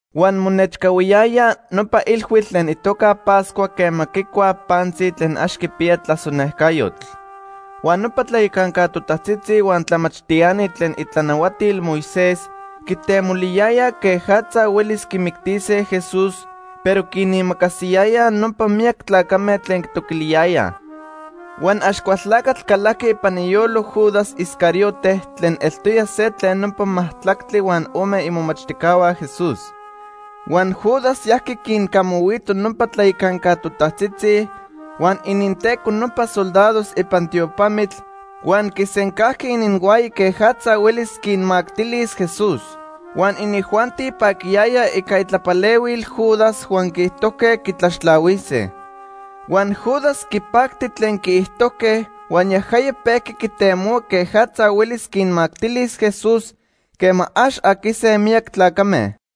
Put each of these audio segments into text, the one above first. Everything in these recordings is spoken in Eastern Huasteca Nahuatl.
Huan monechcahuiyaya nopa ilhuitl tlen itoca Pascua quema quicuaj pantzi tlen ax quipiya tlasonejcayotl. Huan nopa tlayacanca totajtzitzi huan tlamachtiani tlen itlanahuatil Moisés quitemoliyayaj quejatza huelis quimictise Jesús, pero quinimacasiyayaj nopa miyac tlacame tlen quitoquiliyayaj. Huan Axcualtlacatl calajqui ipan iyolo Judas Iscariote tlen eltoya se tlen nopa majtlactli huan ome imomachtijcahua Jesús. Huan Judas yajqui quincamahuito nopa tlayacanca totajtzitzi huan ininteco nopa soldados ipan tiopamitl, huan quisencajqui ininhuaya quejatza huelis quinmactilis Jesús. Huan inijuanti paquiyayaj ica itlapalehuil Judas huan quiijtojque quitlaxtlahuise. Huan Judas quipacti tlen quiijtojque huan yajaya pejqui quitemohua quejatza huelis quinmactilis Jesús quema ax aquise miyac tlacame.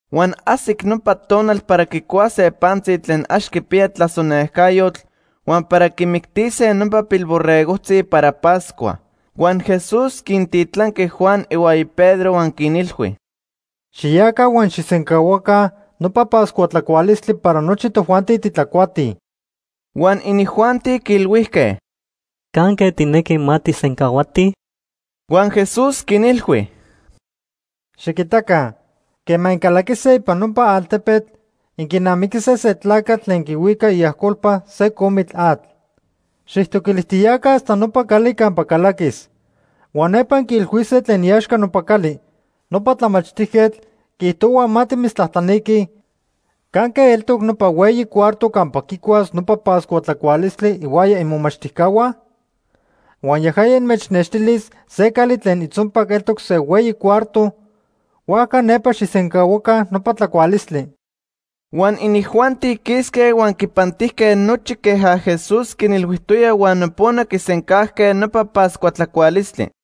Huan ajsic nopa tonal para quicuase pantzi tlen ax quipiya tlasonejcayotl, huan para quimictise nopa pilborregojtzi para Pascua. Huan Jesús quintitlanqui Juan ihuaya Pedro huan quinilhui: ―Xiyaca huan xijsencahuaca nopa Pascua tlacualistli para nochi tojuanti titlacuatij. Huan inijuanti quiilhuijque: ―¿Canque tijnequi ma tijsencahuatij? Huan Jesús quinilhui: ―Xiquitaca, quema incalaquise ipan nopa altepetl, inquinamiquise se tlacatl tlen quihuica iajcolpa se comitl atl. Xijtoquilijtiyaca hasta nopa cali campa calaquis. Huan nepa inquiilhuise tlen iaxca nopa cali: ‘Nopa tlamachtijquetl quiijtohua ma timitztlajtlaniquij, ¿canque eltoc nopa hueyi cuarto campa quicuas nopa Pascua tlacualistli ihuaya imomachtijcahua?’ Huan yajaya inmechnextilis se cali tlen itzonpac eltoc se hueyi cuarto, huajca nepa xijsencahuaca nopa tlacualistli. Huan inijuanti quisque huan quipantijque nochi queja Jesús quinilhuijtoya huan nopona quisencajque nopa Pascua tlacualistli.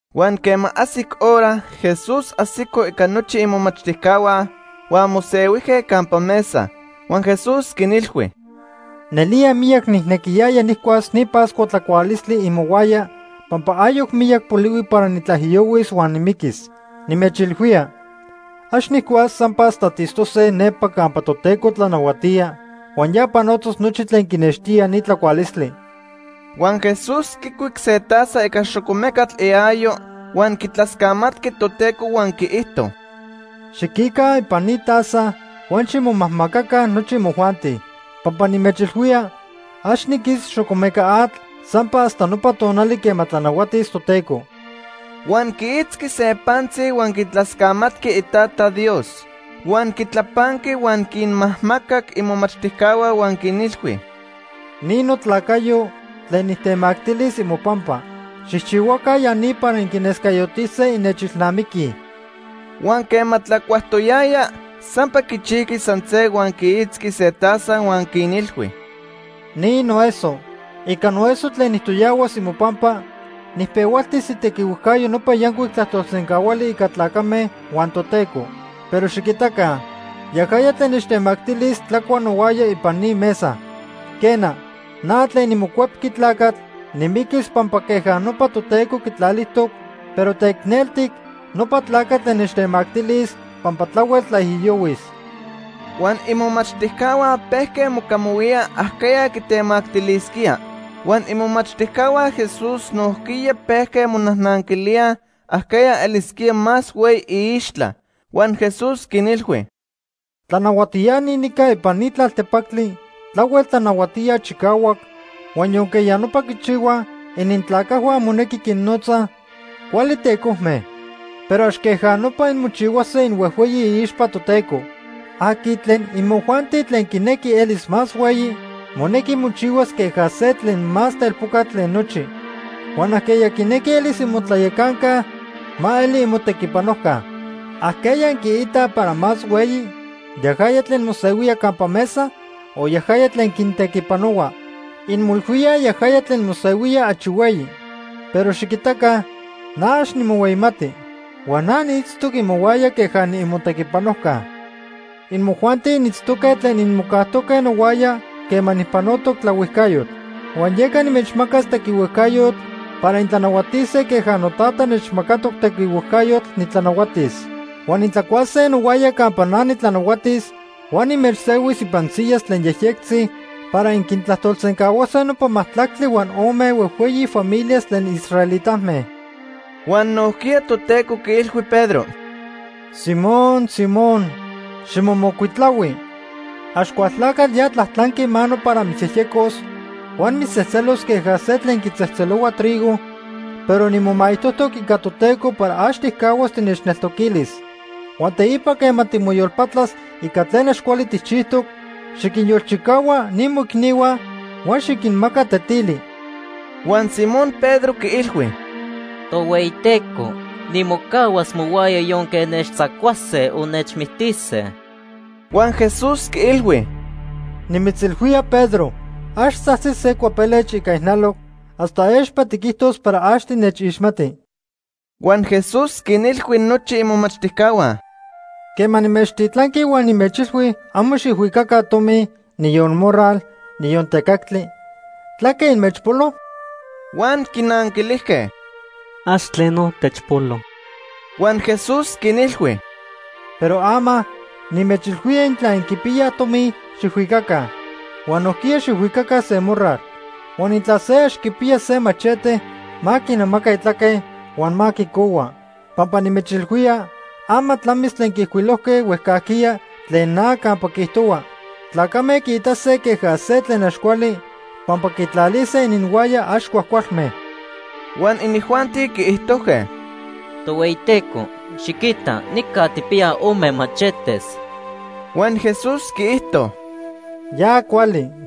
Huan quema ajsic hora, Jesús ajsico ica nochi imomachtijcahua huan mosehuijque campa mesa. Huan Jesús quinilhui: ―Nelía miyac nijnequiyaya nijcuas ni Pascua tlacualistli imohuaya pampa ayoc miyac polihui para nitlaijiyohuis huan nimiquis. Nimechilhuía, ax nijcuas sampa hasta tiitztose nepa campa Toteco tlanahuatía huan ya panotos nochi tlen quinextía ni tlacualistli. Huan Jesús quicuic se taza ica xocomecatl iayo huan quitlascamatqui Toteco huan quiijto: ―Xiquica ipan ni taza huan ximomajmacaca nochi imojuanti. Pampa nimechilhuía, ax niquis xocomeca atl sampa hasta nopa tonali quema tlanahuatis Toteco. Huan quiitzqui se pantzi huan quitlascamatqui Itata Dios. Huan quitlapanqui huan quinmajmacac imomachtijcahua huan quinilhui: ―Ni notlacayo tlen nitemactilis imopampa. Xijchihuaca ya ni para inquinescayotise innechilnamiquij. Huan quema tlacuajtoyajya, sampa quichijqui san se huan quiitzqui se taza huan quinilhui: ―Ni noeso. Ica noeso tlen nijtoyahuas imopampa nijpehualtis itequihuejcayo nopa yancuic tlajtolsencahuali ica tlacame huan Toteco. Pero xiquitaca, yajaya tlen nechtemactilis tlacua nohuaya ipan ni mesa. Quena, na tlen niMocuepqui Tlacatl nimiquis pampa queja nopa Toteco quitlalijtoc, pero teicneltic nopa tlacatl tlen nechtemactilis pampa tlahuel tlaijiyohuis. Huan imomachtijcahua pejque mocamahuíaj ajqueya quitemactilisquía. Huan imomachtijcahua Jesús nojquiya pejque monajnanquilíaj ajqueya elisquía más hueyi iixtla. Huan Jesús quinilhui: “Tlanahuatiani nica ipan ni tlaltepactli tlahuel tlanahuatíaj chicahuac huan yonque ya nopa quichihuaj inintlacajhua monequi quinnotzaj ‘cuali tecojme’. Pero ax queja nopa inmochihuase inhuejhueyi iixpa Toteco. Aqui tlen imojuanti tlen quinequi elis más hueyi, monequi mochihuas queja se tlen más telpocatl tlen nochi. Huan ajqueya quinequi elis imotlayacanca, ma eli inmotequipanojca. ¿Ajqueya inquiitaj para más hueyi, yajaya tlen mosehuía campa mesa o yajaya tlen quintequipanohua? Inmoilhuíaj yajaya tlen mosehuía achi hueyi. Pero xiquitaca na ax nimohueyimati. Huan na niitztoc imohuaya queja niimotequipanojca. “Imojuanti initztoque tlen inmocajtoque nohuaya quema nijpanotoc tlaohuijcayotl. Huan yeca nimechmacas tequihuejcayotl para intlanahuatise queja Notata nechmacatoc tequihuejcayotl nitlanahuatis. Huan intlacuase nohuaya campa na nitlanahuatis huan nimechsehuis ipan siyas tlen yejyectzi para inquintlajtolsencahuase nopa majtlactli huan ome huejhueyi familias tlen israelitame.” Huan nojquiya Toteco quiilhui Pedro: ―Simón, Simón, ximomocuitlahui. Axcualtlacatl ya tlajtlanqui mano para mitzyejyecos huan mitztzejtzelos queja se tlen quitzejtzelohua trigo, pero nimomaijtojtoc ica Toteco para ax tijcahuas tinechneltoquilis. Huan teipa quema timoyolpatlas ica tlen ax cuali tijchijtoc, xiquinyolchicahua ni moicnihua huan xiquinmaca tetili. Huan Simón Pedro quiilhui: ―Tohueyiteco, nimocahuas mohuaya yonque nechtzacuase o nechmictise. Huan Jesús quiilhui: ―Nimitzilhuía Pedro, ax tzajtzis se cuapelech ica ijnaloc hasta expa tiquijtos para ax tinechixmati. Huan Jesús quinilhui nochi imomachtijcahua: ―Quema nimechtitlanqui huan nimechilhui amo xijhuicaca tomi, niyon morral, niyon tecactli, ¿tlaque inmechpolo? Huan quinanquilijque: ―Ax tleno techpolo. Huan Jesús quinilhui: ―Pero ama, nimechilhuía intla inquipiyaj tomi, xijhuicaca. Huan nojquiya xijhuicaca se morral. Huan intla se ax quipiya se machete, ma quinamaca itlaque huan ma quicohua. Pampa nimechilhuía, ama tlamis tlen quiijcuilojque huejcajquiya tlen na campa quiijtohua: ‘Tlacame quiitase queja se tlen ax cuali pampa quitlalise ininhuaya ax cuajcualme.’ Huan inijuanti quiijtojque: ―Tohueyiteco, xiquita nica tijpiyaj ome machetes. Huan Jesús quiijto: ―Ya cuali.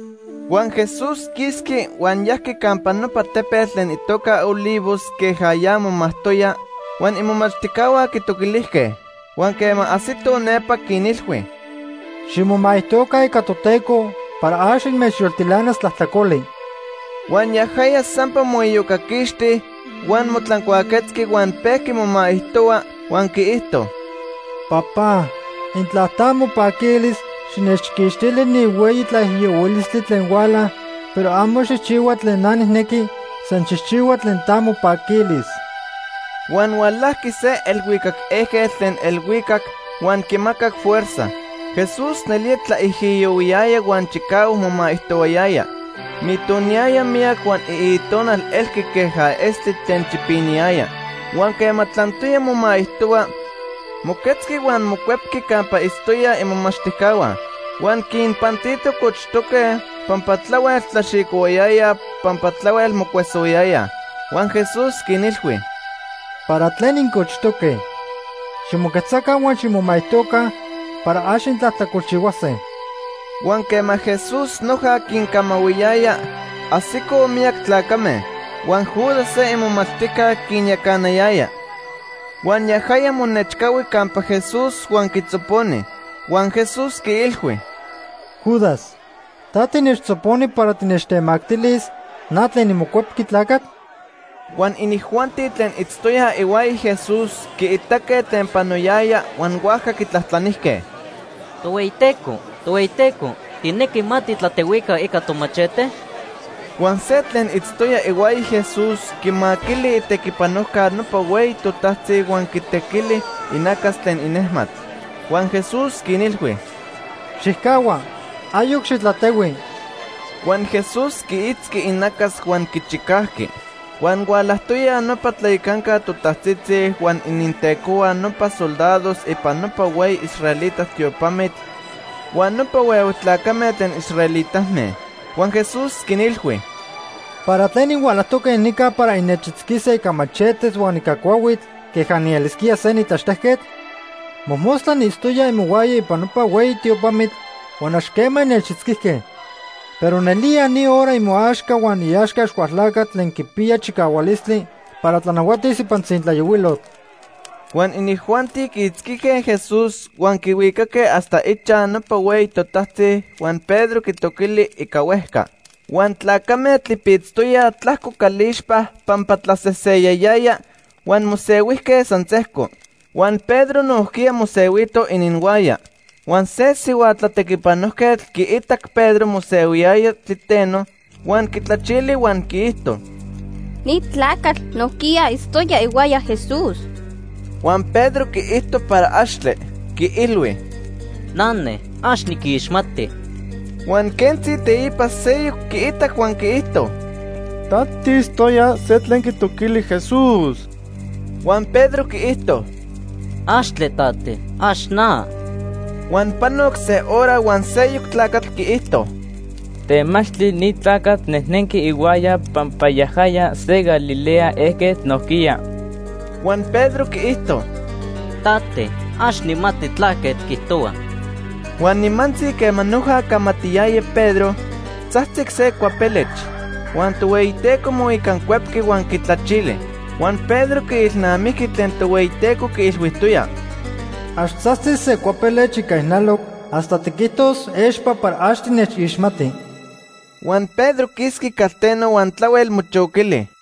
Huan Jesús quisqui huan yajqui campa nopa tepetl tlen itoca Olivos queja ya momajtoya, huan imomachtijcahua quitoquilijque. Huan quema ajsitoj nepa, quinilhui: ―Ximomaijtoca ica Toteco para ax inmechyoltilanas tlajtlacoli. Huan yajaya sampa moiyocaquixti, huan motlancuaquetzqui, huan pejqui momaijtohua, huan quiijto: “Papá, intla ta mopaquilis, xinechquixtili ni hueyi tlaijiyohuilistli tlen huala, pero amo xijchihua tlen na nijnequi, san xijchihua tlen ta mopaquilis.” Huan hualajqui se elhuicac ejquetl tlen elhuicac huan quimacac fuerza. Jesús nelía tlaijiyohuiyaya huan chicahuac momaijtohuayaya. Mitoniyaya miyac huan iitonal elqui queja estli tlen chipiniyaya. Huan quema tlantoya momaijtohua, moquetzqui huan mocuepqui campa itztoyaj imomachtijcahua. Huan quinpantito cochtoque pampa tlahuel tlaxicohuayayaj pampa tlahuel mocuesohuayayaj. Huan Jesús quinilhui: ―¿Para tlen incochtoque? Ximoquetzaca huan ximomaijtoca para ax intlajtlacolchihuase. Huan quema Jesús noja quincamahuiyaya, ajsicoj miyac tlacame. Huan Judas se imomachtijca quinyacanayaya. Huan yajaya monechcahui campa Jesús huan quitzoponi. Huan Jesús quiilhui: ―Judas, ¿ta tinechtzoponi para tinechtemactilis na tlen niMocuepqui Tlacatl? Huan inijuanti tlen itztoyaj ihuaya Jesús quiitaque tlen panoyaya huan huajca quitlajtlanijque: ―Tohueyiteco, Tohueyiteco, ¿tijnequi ma titlatehuica ica tomachete? Huan se tlen itztoya ihuaya Jesús, quimaquili itequipanojca nopa hueyi totajtzi huan quitequili inacas tlen inejmatl. Huan Jesús quinilhui: ―¡Xijcahua! Ayoc xitlatehui. Huan Jesús quiitzqui inacas huan quichicajqui. Huan hualajtoyaj nopa tlayacanca totajtzitzi huan inintecohua nopa soldados ipan nopa hueyi israelita tiopamitl huan nopa huehue tlacame tlen israelitame. Huan Jesús quinilhui: ―¿Para tlen inhualajtoque nica para innechitzquise ica machetes huan ica cuahuitl queja nielisquía se nitlaxtejquetl? Mojmostla niitztoya imohuaya ipan nopa hueyi tiopamitl, huan ax quema innechitzquijque. Pero nelía ni hora imoaxca huan iaxca Axcualtlacatl tlen quipiya chicahualistli para tlanahuatis ipan tzintlayohuilotl. Huan inijuanti quiitzquijque Jesús, huan quihuicaque hasta ichaj nopa hueyi totajtzi huan Pedro quitoquili ica huejca. Huan tlacame tlipitztoyaj tlajco calixpa pampa tlaseseyayaya huan mosehuijque san sejco. Huan Pedro nojquiya mosehuito ininhuaya. Huan se sihua tlatequipanojquetl quiitac Pedro mosehuiyaya tliteno huan quitlachili huan quiijto: ―Ni tlacatl nojquiya itztoya ihuaya Jesús. Huan Pedro quiijto para axtle. Quiilhui: ―Nane, ax niquixmati. Huan quentzi teipa seyoc quiitac huan quiijto: ―Ta tiitztoya se tlen quitoquili Jesús. Huan Pedro quiijto: ―¡Axtle, Tate! ¡Ax na! Huan panoc se hora huan seyoc tlacatl quiijto: ―Temachtli ni tlacatl nejnenqui ihuaya pampa yajaya se Galilea ejquetl nojquiya. Huan Pedro quiijto: ―Tate, ax nijmati tlaque tiquijtohua. Huan nimantzi quema noja camatiyaya Pedro, tzajtzic se cuapelech. Huan Tohueyiteco moicancuepqui huan quitlachili. Huan Pedro quiilnamijqui tlen Tohueyiteco quiilhuijtoya: “Ax tzajtzis se cuapelech ica ijnaloc hasta tiquijtos expa para ax tinechixmati.” Huan Pedro quisqui calteno huan tlahuel mochoquili.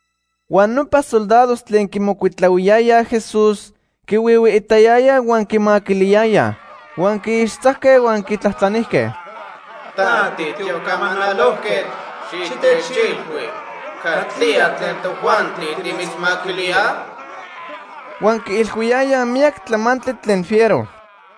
Huan nopa soldados tlen quimocuitlahuiyayaj Jesús quihuihuiitayayaj huan quimaquiliyayaj. Huan quiixtzajque huan quitlajtlanijque: ―Ta tiocamanalojquetl, xitechilhui, ¿catlía tlen tojuanti timitzmaquilíaj? Huan quiilhuiyayaj miyac tlamantli tlen fiero.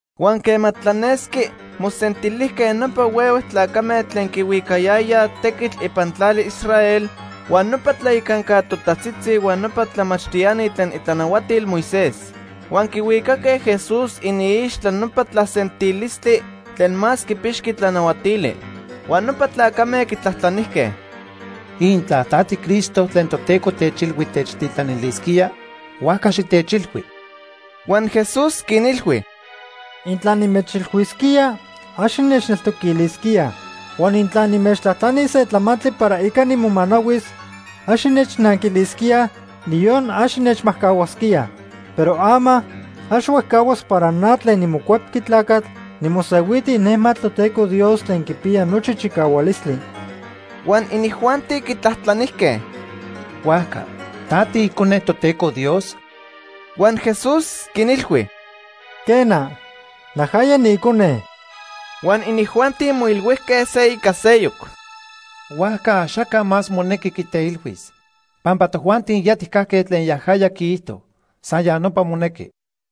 Huan quema tlanesqui, mosentilijque nopa huehue tlacame tlen quihuicayayaj tequitl ipan tlali Israel, huan nopa tlayacanca totajtzitzi huan nopa tlamachtiani tlen itlanahuatil Moisés. Huan quihuicaque Jesús iniixtla nopa tlasentilistli tlen más quipixqui tlanahuatili. Huan nopa tlacame quitlajtlanijque: ―Intla ta tiCristo tlen Toteco techilhui techtitlanilisquía, huajca xitechilhui. Huan Jesús quinilhui: ―Intla nimechilhuisquía, ax innechneltoquilisquíaj. Huan intla nimechtlajtlanis se tlamantli para ica nimomanahuis, ax innechnanquilisquíaj, niyon ax innechmajcahuasquíaj. Pero ama, ax huejcahuas para na tlen niMocuepqui Tlacatl nimosehuiti inejmatl Toteco Dios tlen quipiya nochi chicahualistli. Huan inijuanti quitlajtlanijque: ―Huajca ¿ta tiIcone Toteco Dios? Huan Jesús quinilhui: ―Quena, najaya niIcone. Huan inijuanti moilhuijque se ica seyoc: ―Huajca axaca más monequi quiteilhuis, pampa tojuanti ya tijcajque tlen yajaya quiijto. San ya nopa monequi.